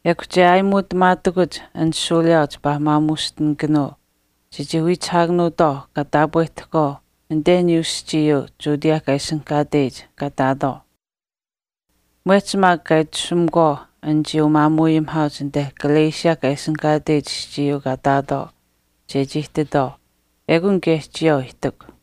Ekw che aayimuutamaatakuch an shuuliyaau chipaa maamuushtinikanuu chechii wiichihaakanuutwaau kaa taapwehtahkwaau anite aniyuu aschiiyuu Judea kaa ishinihkaateyich kaa ihtaatwaau. Mwehch maak kaa itashumakwaau anichii umaamuuayimihaauch anite Galatia kaa ishinihkaateyich aschiiyuu kaa ihtaatwaau chechii ihtitwaau ekun kaye chiyawaau ihtikw.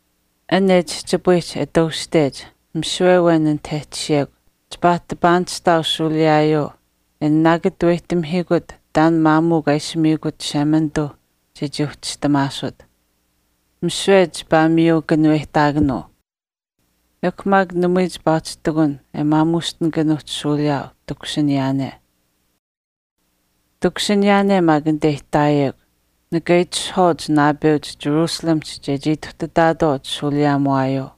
An e chihchipayihch e tuushtech, misiwe awen anit e tashiyekw chipaa pahkaanishtaau shuuliyaayuu e nanaakataweyihtamihiikut taan maamuu kaa ishi miikut Chishemanituuh chechii uhchistamaasut. Misiwe chipaa maamuu kanuweyihtaakanuu. Ekw maak namui chipaa uhchi ihtakun e maamuushtinikanuuhch shuuliyaau takushiniyaane. Takushiniyaane maak anite e ihtaayekw, nika itishahwaauch naapeuch Jerusalemihch chechii ituhtataatwaau chishuuliyaamuwaayuu.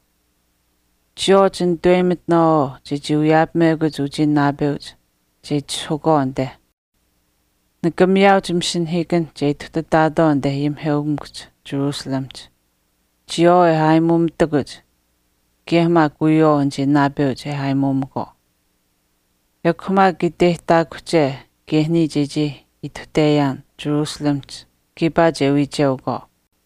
Chiyawaau chinitaweyimitinaawaau chechii wiyaapamekuch uchii naapeuch che itishahukwaau anite. Nika miyaauch masinahiikanh che ituhtataatwaau anite ayimiheukamikuhch Jerusalemihch, chiyawaau e aayimuumitakuch kaye maak wiyawaau anichii naapeuch e aayimuumakwaau. Ekw maak iteyihtaakuhche kaye niya chechii ituhteyaan Jerusalemihch kiipaa che wiicheukwaau.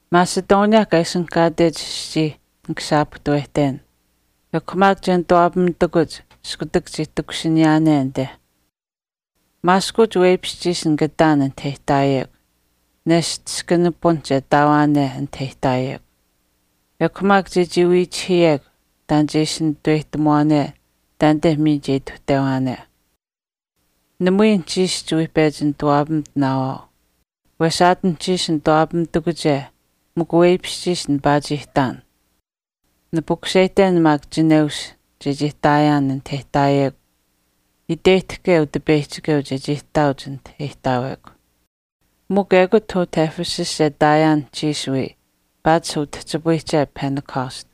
Macedonia kaa ishinihkaatech aschii nika shaapuhtawehten. Ekw maak che nituwaapamitakuch iskutak chii ituhteyaane anite. Maaskuuch weipishchiish nika ihtaan anit e ihtaayekw, nesht iskan pipun che ihtaawaane anit e ihtaayekw. Ekw maak chechii wiichihiyekw taan che ishi nitaweyihtamuwaane taanite miin che ituhtewaane. Namui anuhchiish chiwii pechi nituwaapamitinaawaau. Wesh aat anuhchiish nituwaapamitakuch mikw weipishchiish nipaa chii ihtaan. Nipukuseyihten maak chineushiish chechii ihtaayaan anit e ihtaayekw iteyihtahke Utipeyihchikeu chechii ihtaauch anit e ihtaawekw. Mikw ekut utah Ephesus che ihtaayaan anuhchiish wii paatish utihchipayihche Pentecost.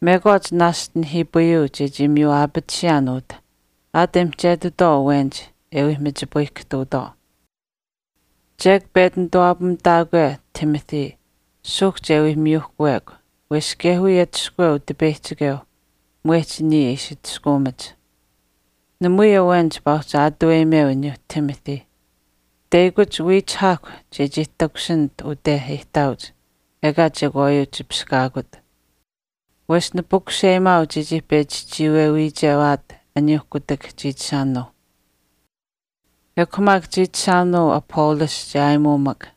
Mekwaach naashch nihiipayuu chechii miyu aapatisiyaan utah aat e mihchetitwaau awenich e wii machipayihkahtuutwaau. Chek pechi nituwaapamitaakwe Timothy suuhk che wii miyuuhkuwekw wesh kaye wiya atushkuweu Utipeyihchikeuh mwehch niya e ishi atushkaamach. Namui awen chipaa uhchi aatuweyimeu aniyuuh Timothy. Teyakuch wiichihaahkw chechii takushinit ute e ihtaauch ekaa chekwaayuu chipishkaakut. Wesh nipukuseyimaau chechii pechi chiiwe wiichewaat aniyuuh kutak chiichishaanuuh. Ekw maak chiichishaanuu Apollos che aayimuumak.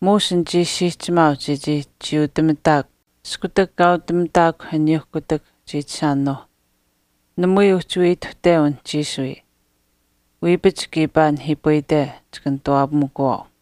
Muush nichii siihchimaau chechii chiiutamitaakw iskutak kaautamitaakw aniyuuh kutak chiichishaanuuh. Namui uhchii wiya ituhteu anuhchiish wii. Wiipach kiipaa nihiipayite chika nituwaapamikuwaau.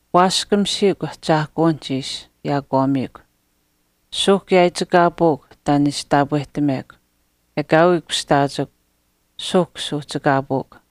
Waaskamisiikw, ahchaahkuwinihch ishi yaakwaamiikw. Suuhk yaaichikaapuukw taan e ishi taapwehtamekw. Ekaawii kushtaachikw. Suuhk suuhchikaapuukw.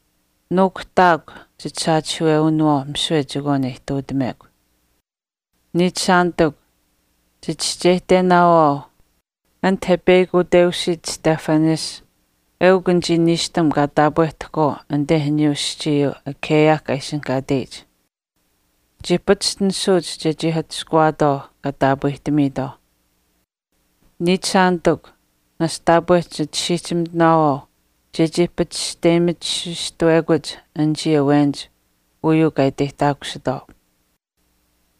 Nuukuhtaakw chisaachihiiwewinawaau misiwe chekwaan e ihtuutamekw. Niichishaanitikw, chichischeyihtenaawaau anit e peyakuteusiit Stephanas eukw anichii niishtam kaa taapweyihtahkwaau anite aniyuu aschiiyuu Achaia kaa ishinihkaateyich. Chii pachishtinisuuch chechii atushkuwaatwaau kaa taapwehtamiitwaauh. Niichishaanitikw, naashch taapweh chisiihchimitinaawaau chechii pachishteyimititisuustawekuch anichii awenich uyuu kaa iteyihtaakusitwaau.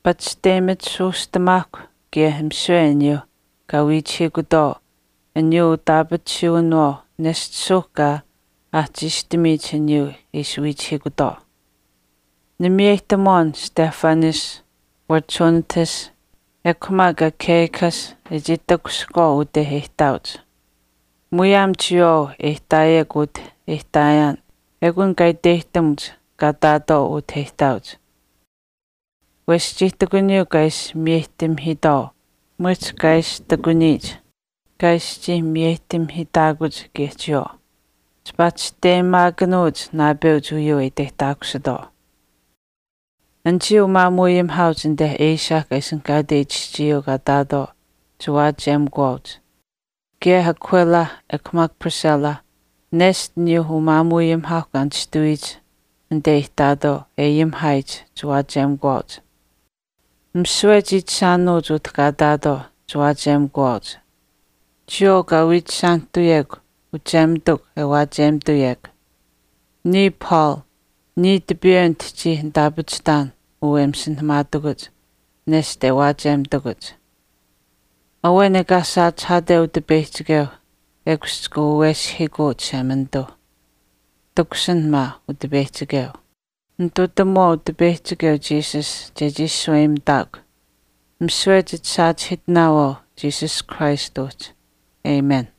Pachishteyimitisuustuumaahkw kaye misiwe aniyuuh kaa wiichihiikutwaau aniyuu utitaapatisuwinawaau nesht suuhk kaa aahchiistamiyich aniyuu e ishi wiichihiikutwaau. Nimiyeyihtamuwaan Stephanas, Fortunatus ekw maak Achaicus e chii takushihkwaau ute e ihtaauch. Muyaam chiyawaau e ihtaayekw utah e ihtaayaan ekun kaa iteyihtamuch kaa ihtaatwaau utah e ihtaauch. Wesh chii ihtakuniyuu kaa ishi miyeyihtamihiitwaau mwehch kaa ishi ihtakuniyich kaa ishi chii miyeyihtamihiitaakuch kaye chiyawaau. Chipaa chisteyimaakanuuch naapeuch uyuu e iteyihtaakusitwaau. Anichii umaamuuayimihaauch anite Asia kaa ishinihkaateyich aschiiyuu kaa ihtaatwaau chiwaachiyemikuwaauch. Kaye Aquila ekw maak Priscilla nesht aniyuuh umaamuuayimihaauh kaa nishtawiyich anite e ihtaatwaau e ayimihaayich chiwaachiyemikuwaauch. Misiwe chiichishaanuuch utah kaa ihtaatwaau chiwaachiyemikuwaauch. Chiyawaau kaa wiichishaanihtuyekw uchemitukw e waachiyemituyekw. Niya Paul. Niya tipiiwe nitihchii nitaapachihtaan uu e masinahamaatakuch neshta e waachiyemitakuch. Awen ekaa saachihaate Utipeyihchikeu, ekush chika waweshihiikuu Chishemanituu. Takushin maa, Utipeyihchikeu. Nitutamuwaau Utipeyihchikeu Jesus chechii shaweyimitaakw. Misiwe chisaachihiitinaawaau Jesus Christ uhchi. Amen.